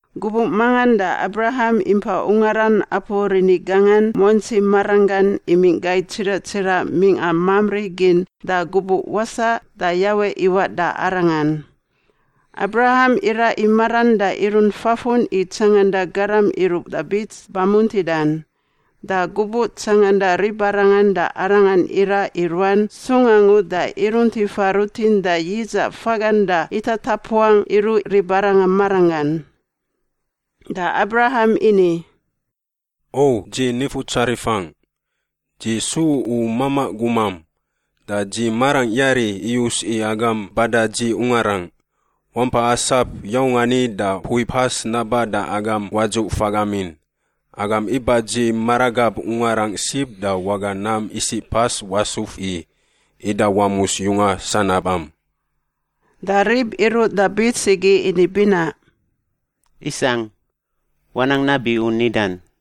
Gubuꞌ mangan da Abraham impa ungaran apu rini gangan muantsi maranggan imingꞌ gai tsiraꞌ tsiraꞌ mingꞌa Mamri gin da gubuꞌ wasaꞌ da Yawe iwaꞌ da arangan. Abraham iraꞌ i maran da irunt fafun i tsanganda garam iruꞌ da bits bamuntidan. Da gubuꞌ tsanganda ribarangan da arangan iraꞌ i ruan sung angu da irunt ifa rutin da yidzaꞌ fagan da itatapuangꞌ iruꞌ ribarangan maranggan. Da Abraham ini, “O dzi nifutsarifangꞌ! Dzi su u mamaꞌ gumam, da dzi marangꞌ yari iyus i agam bada dzi ungarangꞌ. Wampa asap yaung ani da mpui pas naba da agam wadzuꞌ fagamin. Agam iba dzi maragab ungarangꞌ sib da waga nam isiꞌ pas wasuf i, ida wamus yunga sanabam.” Da rib iruꞌ da bits igi ini binaꞌ, “Isangꞌ. Wanang nabi u nidan.”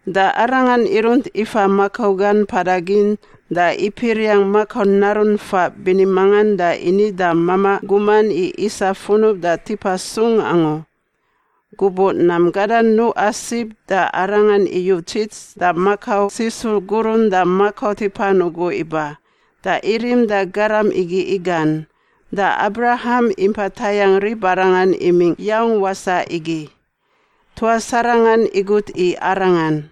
Da arangan irunt ifa makau gan mpada gin da ipiriangꞌ makau narun faꞌ bini mangan da ini da mamaꞌ guman i isa funub da tipa sung angu. Gubuꞌ nam gadan nuꞌa sib da arangan iyu tsis da makau sisu gurun da makau tipan ugu iba, da irim da garam igi igan, da Abraham impa tayangꞌ ribarangan imingꞌ yaung wasaꞌ igi. Tuas arangan igut i arangan,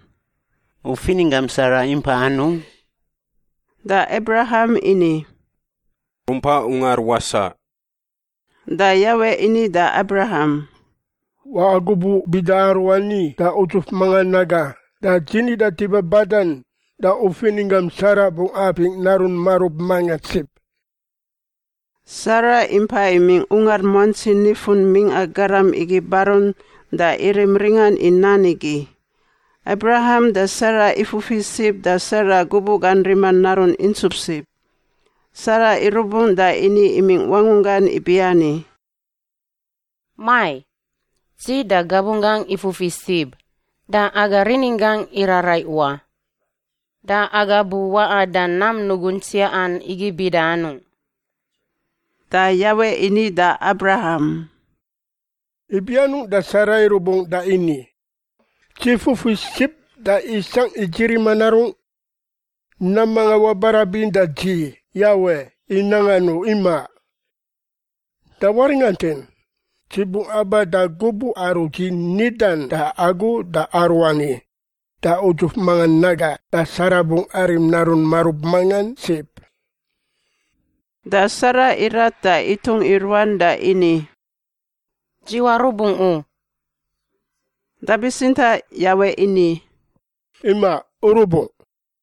“U fininggam Sara impa anungꞌ?” Da Abraham ini, “Rumpa ungar wasaꞌ.” Da Yawe ini da Abraham, “Waꞌa gubuꞌ bida aruani da udzuf mangan aga da dzi nida tipa badan da u fininggam Sara bungꞌ apingꞌ narun marub mangan sib.” Sara impa imingꞌ ungar muantsi nifun mingꞌa garam igi barun da irim ringan i nan igi. Abraham da Sara ifufi sib da Sara gubuꞌ gan rima narun intsup sib. Sara irubungꞌ da ini imingꞌ wangunggan ibiani, “Mai, dzi da gabunggangꞌ ifufi sib, da aga rininggangꞌ iraraiꞌ wa. Da aga bu waꞌa da nam nugun tsiaꞌan igi bida anung?” Da Yawe ini da Abraham, “Ibi anungꞌ da Sara irubungꞌ da ini, ‘Dzi fufi sib da isangꞌ i dzi rima narungꞌ?’ Nam mangan wabarabin da Dzi, Yawe, i nangan u. Imaꞌ. Da waringantin. Dzi bungꞌ aba da gubuꞌ aru Dzi nidan da agu da aruani da udzuf mangan aga da Sara bungꞌ arim narun marub mangan sib.” Da Sara irat da itung i ruan da ini, “Dzi warubungꞌ u.” Da bitsintaꞌ Yawe ini, “Imaꞌ. U rubungꞌ.”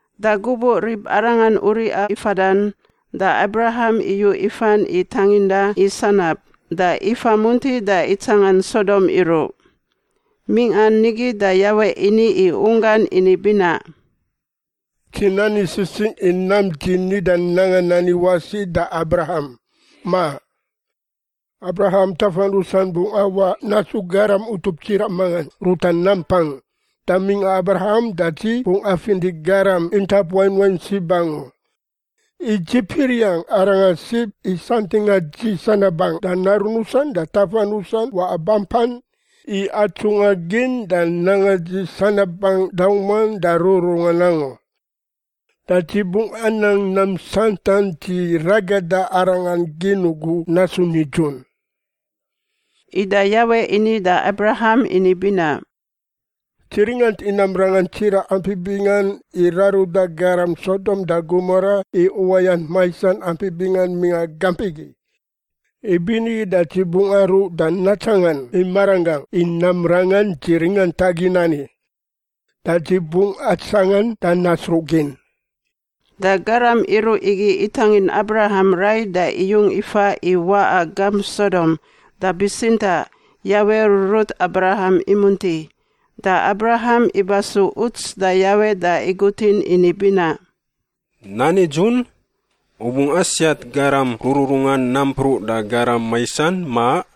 Da gubuꞌ ribarangan uriꞌa i fadan da Abraham iyu ifan i tanginda i sanab, da ifa munti da itsangan Sodom iruꞌ. Mingꞌan nigi da Yawe ini i unggan ini binaꞌ, “Dzi nani sisingꞌ i nam Dzi nida nangan ani wasi da Abraham, ma? Abraham tafan rusan bungꞌ awaꞌ nasu garam utup tsiraꞌ mangan ruta nampang, da mingꞌa Abraham da Dzi bungꞌ afinti garam intap wain wain sib angu. I dzi piriangꞌ arangan sib i santingꞌa Dzi sanabangꞌ da narun rusan da tafan rusan waꞌa bampan i atsungꞌa gin da nanga Dzi sanabangꞌ dauman da rururungan angu. Da Dzi bungꞌ anang nam santan dzi ragada arangan gin ugu nasu nidzun.” Ida Yawe ini da Abraham ini binaꞌ, “Dzi ringant i nam rangan tsiraꞌ ampi bingan i raruda garam Sodom da Gomora i uwayant maisan ampi bingan mingꞌa gamp igi. Ibinigi da Dzi bungꞌ aruꞌ da natsangan i maranggangꞌ i nam rangan Dzi ringantagin ani. Da Dzi bungꞌ atsangan da nasruꞌgin.” Da garam iruꞌ igi itangin Abraham rai da iyung ifa i waꞌa gamp Sodom, da bitsintaꞌ Yawe rurut Abraham imunti. Da Abraham iba su uts da Yawe da igutin ini binaꞌ, “Nan nidzun? U bungꞌ asiat garam rururungan nampruꞌ da garam maisan, ma?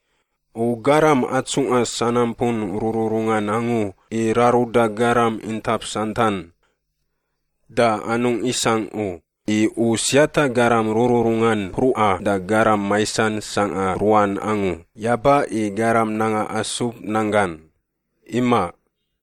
U Garam atsungꞌa sanampun rururungan angu i raruda garam intap santan. Da anungꞌ isangꞌ u, i U siata garam rururungan mpruꞌa da garam maisan sangꞌa ruan angu, yaba i garam nanga asub nanggan. Imaꞌ!”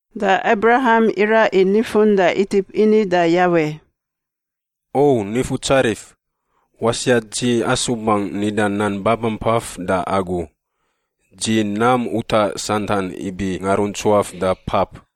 Da Abraham iraꞌ i nifun da itip ini da Yawe, “O Nifutsarif, wasiat dzi asubangꞌ nida nan babampaf da Agu. Dzi nam utaꞌ santan ibi ngaruntsuaf da pap.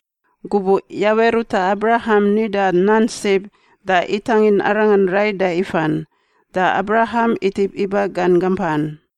Gubuꞌ Yawe ruta Abraham nida nan sib, da itangin arangan rai da ifan. Da Abraham itip iba gan gampan.